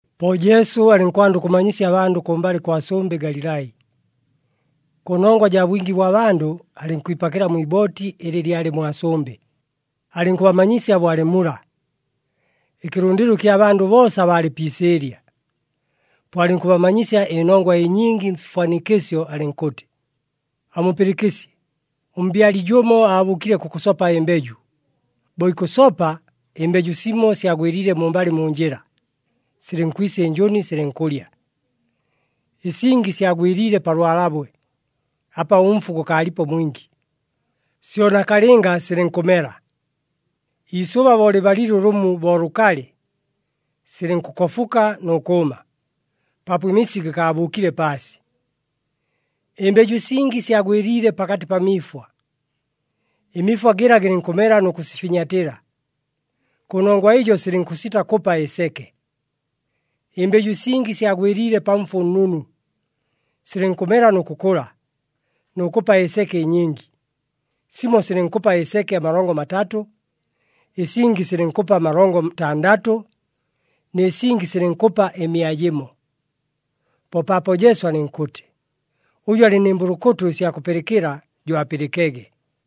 Po Jesu alɨnkwanda ʉkʉbamanyisya abandʉ kʉmbalɨ kwa sʉmbɨ Galilai. Kʉnongwa jaa bwingi bwa bandʉ, alɨnkwipakɨla mwi ibooti ɨlɨ lyalɨ mwa sʉmbɨ, alɨnkʉbamanyisya bo alɨ mula. Ɨkɨlʉndɨlo ɨkya bandʉ boosa baalɨ pi isɨɨlya. Po alɨnkʉbamanyisya ɨnongwa ɨnyingi mfifwanikɨsyo, alɨnkʉtɨ, “Amupɨlɨkɨsye! Ʉmbyali jʉmo aabʉʉkile kʉkʉsopa ɨmbeju. Bo ikʉsopa, ɨmbeju simo syagwɨliile mumbalɨ mu njɨla, silɨnkwisa ɨnjʉni silɨnkʉlya. Ɨsingi syagwɨliile pa lwalabwe, apa ʉmfu gʉkaalipo mwingi. Syo nakalɨnga silɨnkʉmela. Iisʉba bo lɨbalile ʉlʉmu bo lʉkalɨ, silɨnkʉkofuka nʉ kʉʉma, paapo ɨmisi gɨkaabʉʉkile paasi. Ɨmbeju ɨsingi syagwɨliile pakatɨ pa miifwa. Ɨmiifwa gɨla gɨlɨnkʉmela nʉ kʉsifinyatɨla. Kʉnongwa ɨjo silɨnkʉsita kʉpa ɨseke. Ɨmbeju ɨsingi syagwɨliile pa mfu ʉnnunu, silɨnkʉmela nʉ kʉkʉla, nʉ kʉpa ɨseke ɨnyingi. Simo silɨnkʉpa ɨseke amalongo matatʉ, ɨsingi silɨnkʉpa amalongo ntandatʉ, nɨ singi silɨnkʉpa ɨmia jɨmo.” Po paapo Jesu alɨnkʉtɨ, “Ʉjʉ alɨ nɨ mbʉlʉkʉtʉ ɨsya kʉpɨlɨkɨla, jo apɨlɨkege!”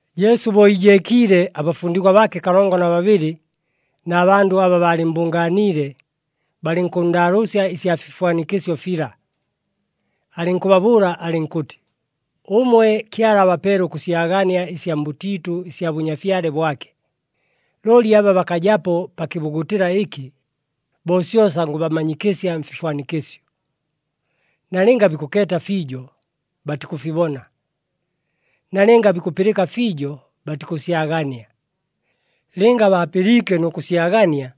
Jesu bo iijeekiile, abafundigwa baake kalongo na babɨlɨ, na bandʉ aba baalɨmmbʉngaaniile, balɨnkʉnndaalʉʉsya ɨsya fifwanikɨsyo fila. Alɨnkʉbabʉʉla alɨnkʉtɨ, “Ʉmwe Kyala abapeele ʉkʉsyagania ɨsya mbʉtiitʉ ɨsya Bʉnyafyale bwake. Looli aba bakajapo pa kɨbugutɨla ɨkɨ, bo syosa ngʉbamanyikɨsya mfifwanikɨsyo. ‘Nalɨnga bikʉkeeta fiijo, batikʉfibona, nalɨnga bikʉpɨlɨka fiijo, batikʉsyagania. Lɨnga baapɨliike nʉ kʉsyagania,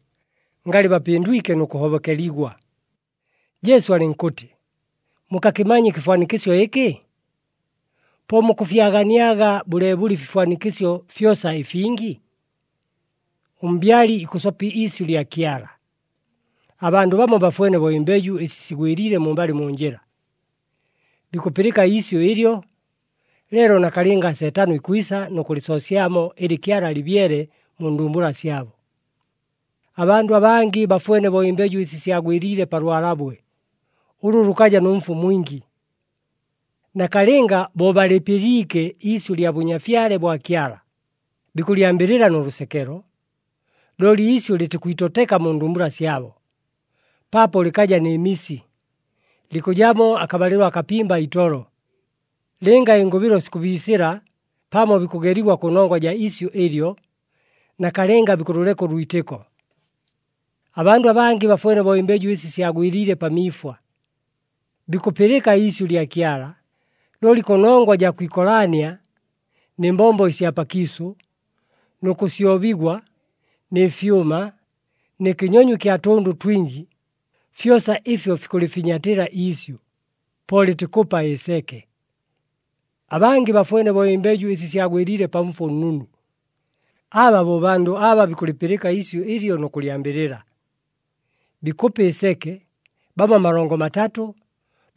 ngalɨ bapɨndwike nʉ kʉhobokeligwa.’” Jesu alɨnkʉtɨ, “Mukakɨmanya ɨkɨfwanikɨsyo ɨkɨ? Po mukʉfyaganiaga bʉleebʉle ɨfifwanikɨsyo fyosa ɨfingi? Ʉmbyali ikʉsopa iisyʉ lya Kyala. Abandʉ bamo bafwene bo ɨmbeju ɨsi sigwɨliile mumbalɨ mu njɨla. Bikʉpɨlɨka iisyʉ ɨlyo, leelo nakalɨnga Seetano ikwisa nʉ kʉlɨsoosyamo ɨlɨ Kyala alɨbyele mu ndumbula syabo. Abandʉ abangɨ bafwene bo ɨmbeju ɨsi syagwɨliile pa lwalabwe, ʉlʉ lʉkaja nʉ mfu mwingi. Nakalɨnga bo balɨpɨliike iisyʉ lya Bʉnyafyale bwa Kyala, bikʉlyambɨlɨla nʉ lʉsekelo. Looli iisyʉ lɨtikwitoteka mu ndumbula syabo, paapo lɨkaja nɨ misi, likʉjamo akabalɨlo akapimba itolo. Lɨnga ɨngʉbɨlo sikʉbiisɨla pamo bikʉgeligwa kʉnongwa jaa isyʉ ɨlyo, nakalɨnga bikʉlʉleka ʉlwitɨko. Abandʉ abangɨ bafwene bo ɨmbeju ɨsi syagwɨliile pa miifwa. Bikʉpɨlɨka iisyʉ lya Kyala, looli kʉnongwa jaa kwikolaania, nɨ mbombo ɨsya pakiisʉ, nʉ kʉsyobigwa, nɨ fyʉma, nɨ kɨnyonyo ɨkya tʉndʉ twingi, fyosa ɨfyo fikʉlɨfinyatɨla iisyʉ, po lɨtikʉpa ɨseke. Abangɨ bafwene bo ɨmbeju ɨsi syagwɨliile pa mfu ʉnnunu. Aba bo bandʉ aba bikʉlɨpɨlɨka iisyʉ ɨlyo, nʉ kʉlyambɨlɨla. Bikʉpa ɨseke, bamo amalongo matatʉ,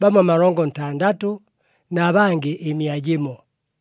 bamo amalongo ntandatʉ, na bangɨ ɨmia jɨmo.”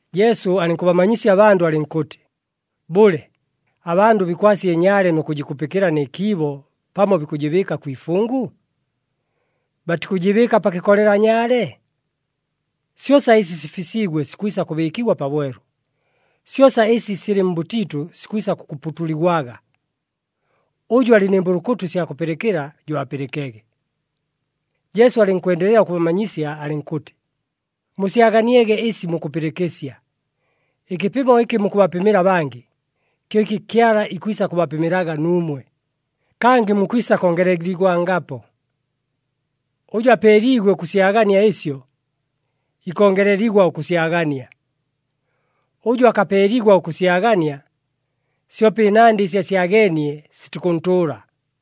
Jesu alɨnkʉbamanyisya abandʉ, alɨnkʉtɨ, “Bʉle, abandʉ bikwasya ɨnyaale nʉ kʉjɨkupɨkɨla nɨ kiibo, pamo bikʉjɨbɨɨka kwi ifungu? Batikʉjɨbɨɨka pa kɨkolela nyaale? Syosa ɨsi sifisiigwe sikwisa kʉbɨɨkigwa pabwelu. Syosa ɨsi silɨ mbʉtiitʉ sikwisa kʉkuputuligwaga. Ʉjʉ alɨ nɨ mbʉlʉkʉtʉ ɨsya kʉpɨlɨkɨla, jo apɨlɨkege!” Jesu alɨnkwendelela ʉkʉbamanyisya alɨnkʉtɨ, “Musyaganiege ɨsi mukʉpɨlɨkɨsya! Ɨkɨpɨmo ɨkɨ mukʉbapɨmɨla abangɨ, kyo ɨkɨ Kyala ikwisa kʉbapɨmɨlaga nuumwe, kangɨ mukwisa kongeleligwangapo. Ʉjʉ apeeliigwe ʉkʉsyagania ɨsyo, ikongeleligwa ʉkʉsyagania. Ʉjʉ akapeeligwa ʉkʉsyagania, syope ɨnandɨ ɨsi asyageenie sitikʉntʉʉla.”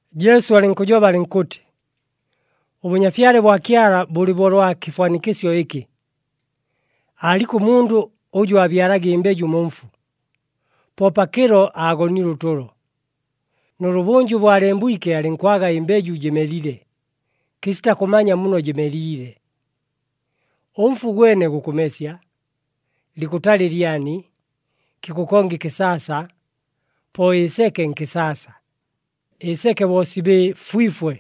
Jesu alɨnkʉjoba alɨnkʉtɨ, “ɄBʉnyafyale bwa Kyala bʉlɨ bo ʉlwa kɨfwanikɨsyo ɨkɨ. Aaliko mundʉ ʉjʉ aabyalaga ɨmbeju mu mfu. Po pakɨlo aagonile ʉtʉlo, nʉlʉbʉnjʉ bo alembwike alɨnkwaga ɨmbeju jɨmelile, kɨsita kʉmanya muno jɨmeliile. Ʉmfu gwene gukʉmesya, likʉtala ɨlyani, kikʉkonga ɨkɨsaasa, po ɨseke nkɨsaasa. Ɨseke bo sibɨfwifwe,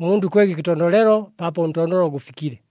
ʉmundʉ ikwega ɨkɨtondolelo, paapo ʉntondolo gʉfikile.”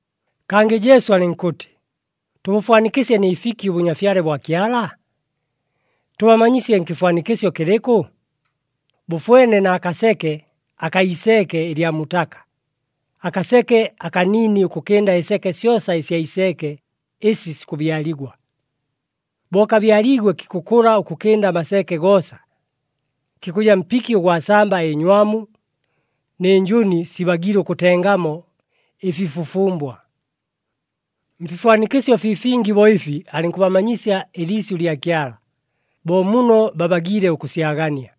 Kangɨ Jesu alɨnkʉtɨ, “Tʉbʉfwanikɨsye nɨ fiki ʉBʉnyafyale bwa Kyala? Tʉbamanyisye nkɨfwanikɨsyo kɨlɨkʉ? Bʉfwene na kaseke akaa iseeke ɨlya mutaka, akaseke akaniini ʉkʉkɨnda ɨseke syosa ɨsya iseeke ɨsi sikʉbyaligwa. Bo kabyaliigwe kikʉkʉla ʉkʉkɨnda amaseeke goosa, kikʉja mpiki ʉgwa samba ɨnywamu, nɨ njʉni sibagiile ʉkʉtengamo ɨfifufumbwa.” Mfifwanikɨsyo fii fingi bo ɨfi alɨnkʉbamanyisya ɨliisyʉ lya Kyala, bo muno babagiile ʉkʉsyagania.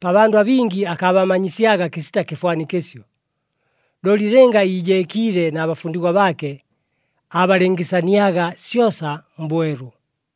Pa bandʉ abingi akaabamanyisyaga kɨsita kɨfwanikɨsyo, looli lɨnga iijeekiile na bafundigwa baake, aabalɨngɨsaniaga syosa mbwelu.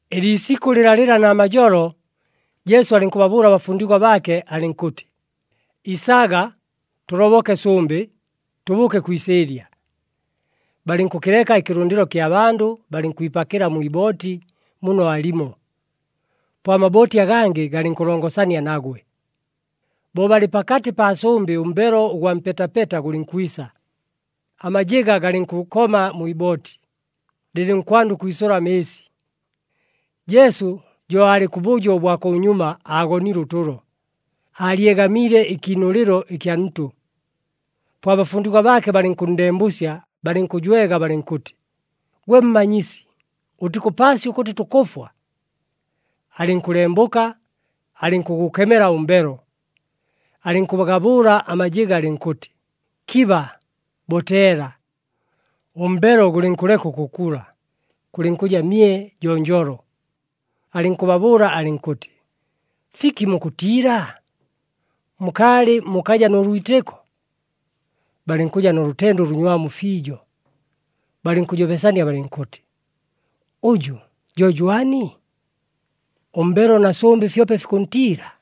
Ɨliisikʉ lɨlalɨla namajolo, Jesu alɨnkʉbabʉʉla abafundigwa baake, alɨnkʉtɨ, “Isaga, tʉloboke sʉmbɨ, tʉbʉʉke kwi isɨɨlya.” Balɨnkʉkɨleka ɨkɨlʉndɨlo kya bandʉ, balɨnkwipakɨla mwi ibooti muno aalimo. Po amabooti agangɨ galɨnkʉlongosania nagwe. Bo balɨ pakatɨ paa sʉmbɨ ʉmbelo ʉgwa mpetapeta gʉlɨnkwisa, amajɨga galɨnkʉkoma mwi ibooti, lɨlɨnkwanda ʉkwisʉla amɨɨsi. Jesu jo aalɨ kʉbʉjo ʉbwa kʉnyuma, aagonile ʉtʉlo, aalyegamiile ɨkiinʉlɨlo ɨkya ntʉ. Po abafundigwa baake balɨnkʉnndembʉsya, balɨnkʉjwega balɨnkʉtɨ, “Gwe Mmanyisi, ʉtikʉpaasya ʉkʉtɨ tukʉfwa!” Alɨnkʉlembʉka, alɨnkʉgʉkemela ʉmbelo, alɨnkʉgabʉʉla amajɨga, alɨnkʉtɨ, “Kiba, boteela!” Ʉmbelo gʉlɨnkʉleka ʉkʉkula, kʉlɨnkʉja mye jonjolo. Alɨnkʉbabʉʉla alɨnkʉtɨ, “Fiki mukʉtiila? Mukaalɨ mukaja nʉ lwitɨko?” Balɨnkʉja nʉ lʉtende ʉlʉnywamu fiijo, balɨnkʉjobesania balɨnkʉtɨ, “Ʉjʉ jo jwani? Ʉmbelo na sʉmbɨ fyope fikʉntiila!”